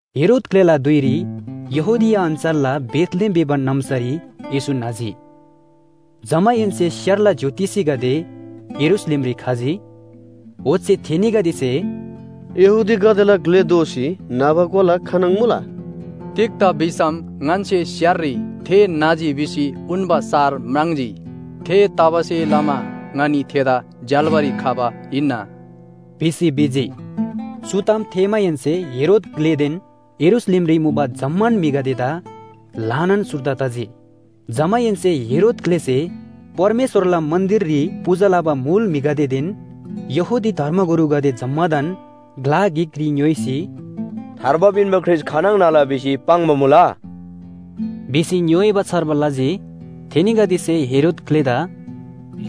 हेरोद ग्‍लेला धुइरी यहूदिया अञ्‍चलला बेथलेहेम भिबा नाम्‍सारी येशू न्‍हजी। जमाहेन्‍से स्‍यारला ज्‍योतिषीगदे यरूशलेमरी खजी, ओच्‍छे थेनीगदेसे, “यहूदीगदेला ग्‍ले दोसी न्‍हबा कोला खानङ मुला? तिग्‍दा भिसम ङन्‍से स्‍याररी थे न्‍हजी भिसी उन्‍बा सार म्राङ्जी। थेतबासेलमा ङनी थेदा झ्‍याल्‍बारी खबा हिन्‍ना” भिसी भिजी। चु ताम थेःमाहेन्‍से हेरोद ग्‍लेदेन यरूशलेमरी मुबा जम्‍मान म्‍हिगदेदा ल्‍हानान सुर्दा तजी। जमाहेन्‍से हेरोद ग्‍लेसे परमेश्‍वरला मन्‍दिररी पूजा लबा मुल म्‍हिगदेदेन यहूदी धर्मगुरुगदे जम्‍मादान ग्‍ला गिकरी ङ्‌योइसी “थार्बा पिन्‍बा ख्रीष्‍ट खानङ न्‍हला भिसी पाङ्बा मुला?” भिसी ङ्‌योइबा छार्बा लजी। थेनीगदेसे हेरोद ग्‍लेदा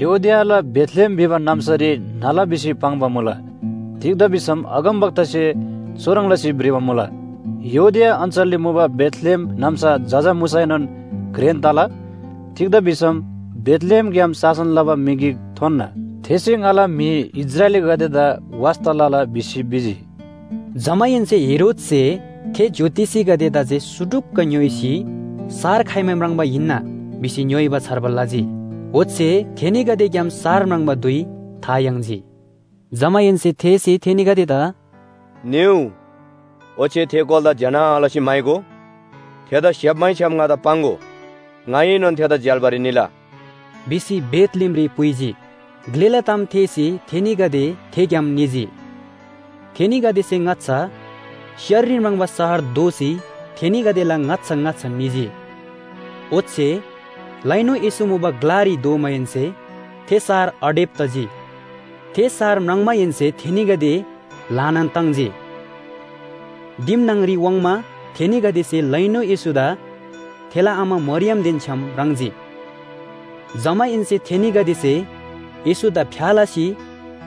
“यहूदियाला बेथलेहेम भिबा नाम्‍सारी न्‍हला भिसी पाङ्बा मुला, तिग्‍दा भिसम अगमवक्तासे चुह्रङ् लसी भ्रिबा मुला, ‘यहूदिया अञ्‍चलरी मुबा बेथलेहेम नाम्‍सा जजा मुसैनोन घ्रेन तला, तिग्‍दा भिसम बेथलेहेमग्‍याम शासन लबा म्‍हि गिक थोन्‍ना, थेसे ङाला म्‍हि इस्राएलीगदेदा वास्‍ता लला’ भिसी भिजी।” जमाहेन्‍से हेरोदसे थे ज्‍योतिषीगदेदा जे सुटुक्‍क ङ्‌योइसी सार खाइमा म्राङ्बा हिन्‍ना, भिसी ङ्‌योइबा छार्बा लजी। ओच्‍छे थेनीगदेग्‍याम सार म्राङ्बा धुइ था याङ्जी। जमाहेन्‍से थेसे थेनीगदेदा “निउ, ओच्‍छे थे कोलादा ज्‍यना लसी म्‍हाइगो। थेदा स्‍याप्‍मैछ्‌याम ङादा पाङ्‍गो, ङाएनोन थेदा झ्‍याल्‍बारी निला” भिसी बेथलेहेमरी पुइजी। ग्‍लेला ताम थेःसी थेनीगदे थेग्‍याम निजी। थेनीगदेसे ङाच्‍छा स्‍याररी म्राङ्बा सार दोःसी थेनीगदेला ङाच्‍छा ङाच्‍छा निजी, ओच्‍छे लैनु येशू मुबा ग्‍लारी धोमाहेन्‍से थे सार अडेब तजी। थे सार म्राङ्माहेन्‍से थेनीगदे ल्‍हानान ताङ्जी। दिम न्‍हङरी वाङ्मा थेनीगदेसे लैनु येशूदा थेला आमा मरियमदेन छ्‌याम म्राङ्जी, जमाहेन्‍से थेनीगदेसे येशूदा फ्‍या लसी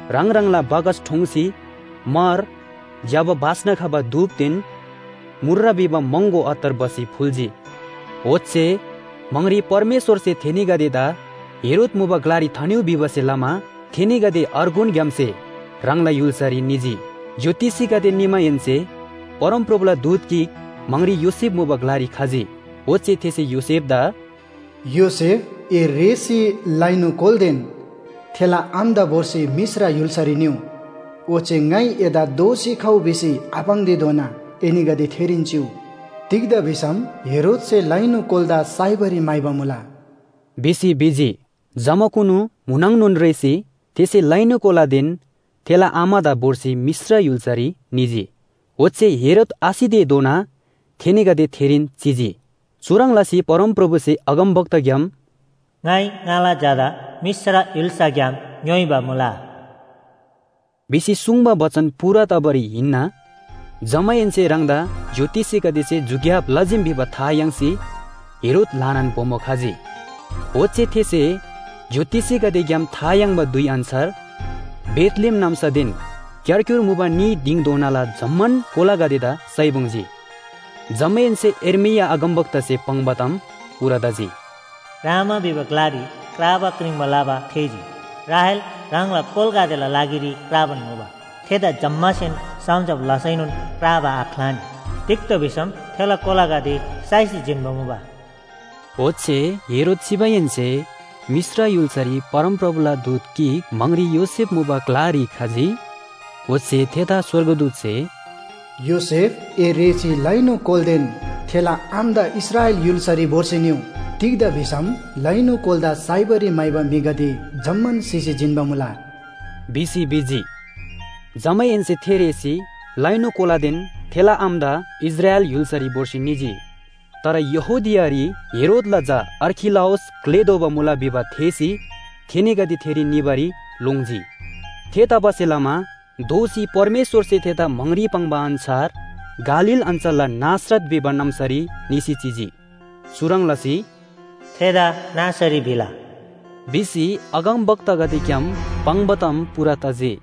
ह्राङ ह्राङला बाकस ठोङ्सी म्‍हर, ज्‍यबा बास्‍ना खबा धूपदेन मूर्र भिबा महँगो अत्तर भसी फुल्‍जी। ओच्‍छे म्‍हाङरी परमेश्‍वरसे थेनीगदेदा हेरोद मुबा ग्‍लारी थानिउ भिबासे लमा थेनीगदे अर्गुन ग्‍यामसे ह्राङला य्‍हुल्‍सारी निजी। ज्‍योतिषीगदे निमाहेन्‍से, परमप्रभुला दूत गिक म्‍हाङरी योसेफ मुबा ग्‍लारी खजी, ओच्‍छे थेसे योसेफदा “योसेफ, ए रेःसी लैनु कोलादेन थेला आमादा भोर्सी मिश्र य्‍हुल्‍सारी निउ। ओच्‍छे ङाइ एदा दोःसी खउ भिसी आपाङ्तेधोना एनीगदे थेरीन चिउ। तिग्‍दा भिसम हेरोदसे लैनु कोलादा साइबारी म्‍हाइबा मुला” भिसी भिजी। जमाकुनु म्‍हुनङनोन रेःसी थेसे लैनु कोलादेन थेला आमादा भोर्सी मिश्र य्‍हुल्‍सारी निजी। ओच्‍छे हेरोद आसितेधोना थेनीगदे थेरीन चिजी। चुह्रङ् लसी परमप्रभुसे अगमवक्ताग्‍याम “ङाइ ङाला झादा मिश्र य्‍हुल्‍साग्‍याम ङ्‌योइबा मुला” भिसी सुङ्बा बचन पूरा तबारी हिन्‍ना। जमाहेन्‍से ह्राङदा ज्‍योतिषीगदेसे झुक्‍याब लजीम भिबा था याङ्सी हेरोद ल्‍हानान बोमो खजी। ओच्‍छे थेसे ज्‍योतिषीगदेग्‍याम था याङ्बा धुइ अन्‍छार बेथलेहेम नाम्‍सादेन क्‍यारक्‍युर मुबा न्‍ही दिङधोनाला जम्‍मान कोलागदेदा साइपुङ्जी। जमाहेन्‍से यर्मिया अगमवक्तासे पाङ्बा ताम पूरा तजी, “रामा भिबा ग्‍लारी क्राबा क्रिङ्बा लबा थेःजी, राहेल ह्राङला कोलागदेला लागिरी क्राबान मुबा। थेदा जम्‍मासेन सम्‍झब लसैनोन क्राबा आख्‍लानी। तिग्‍दा भिसम थेला कोलागदे साइसी जिन्‍बा मुबा।” ओच्‍छे हेरोद सिमाहेन्‍से, मिश्र य्‍हुल्‍सारी परमप्रभुला दूत गिक म्‍हाङरी योसेफ मुबा ग्‍लारी खजी, ओच्‍छे थेदा स्‍वर्गदूतसे, “योसेफ, ए रेःसी लैनु कोलादेन थेला आमादा इस्राएल य्‍हुल्‍सारी भोर्सी निउ। तिग्‍दा भिसम लैनु कोलादा साइबारी म्‍हाइबा म्‍हिगदे जम्‍मान सिसी जिन्‍बा मुला” भिसी भिजी। जमाहेन्‍से थे रेःसी लैनु कोलादेन थेला आमादा इस्राएल य्‍हुल्‍सारी भोर्सी निजी। तर यहूदियारी हेरोदला झा अर्खिलाउस ग्‍ले दोबा मुला भिबा थेःसी थेनीगदे थेरी निबारी लोङ्जी। थेतबासेलमा दोःसी परमेश्‍वरसे थेदा म्‍हाङरी पाङ्बा अन्‍छार गालील अञ्‍चलला नासरत भिबा नाम्‍सारी निसी चिजी। चुह्रङ् लसी “थेदा नासरी भिला” भिसी अगमवक्तागदेग्‍याम पाङ्बा ताम पूरा तजी।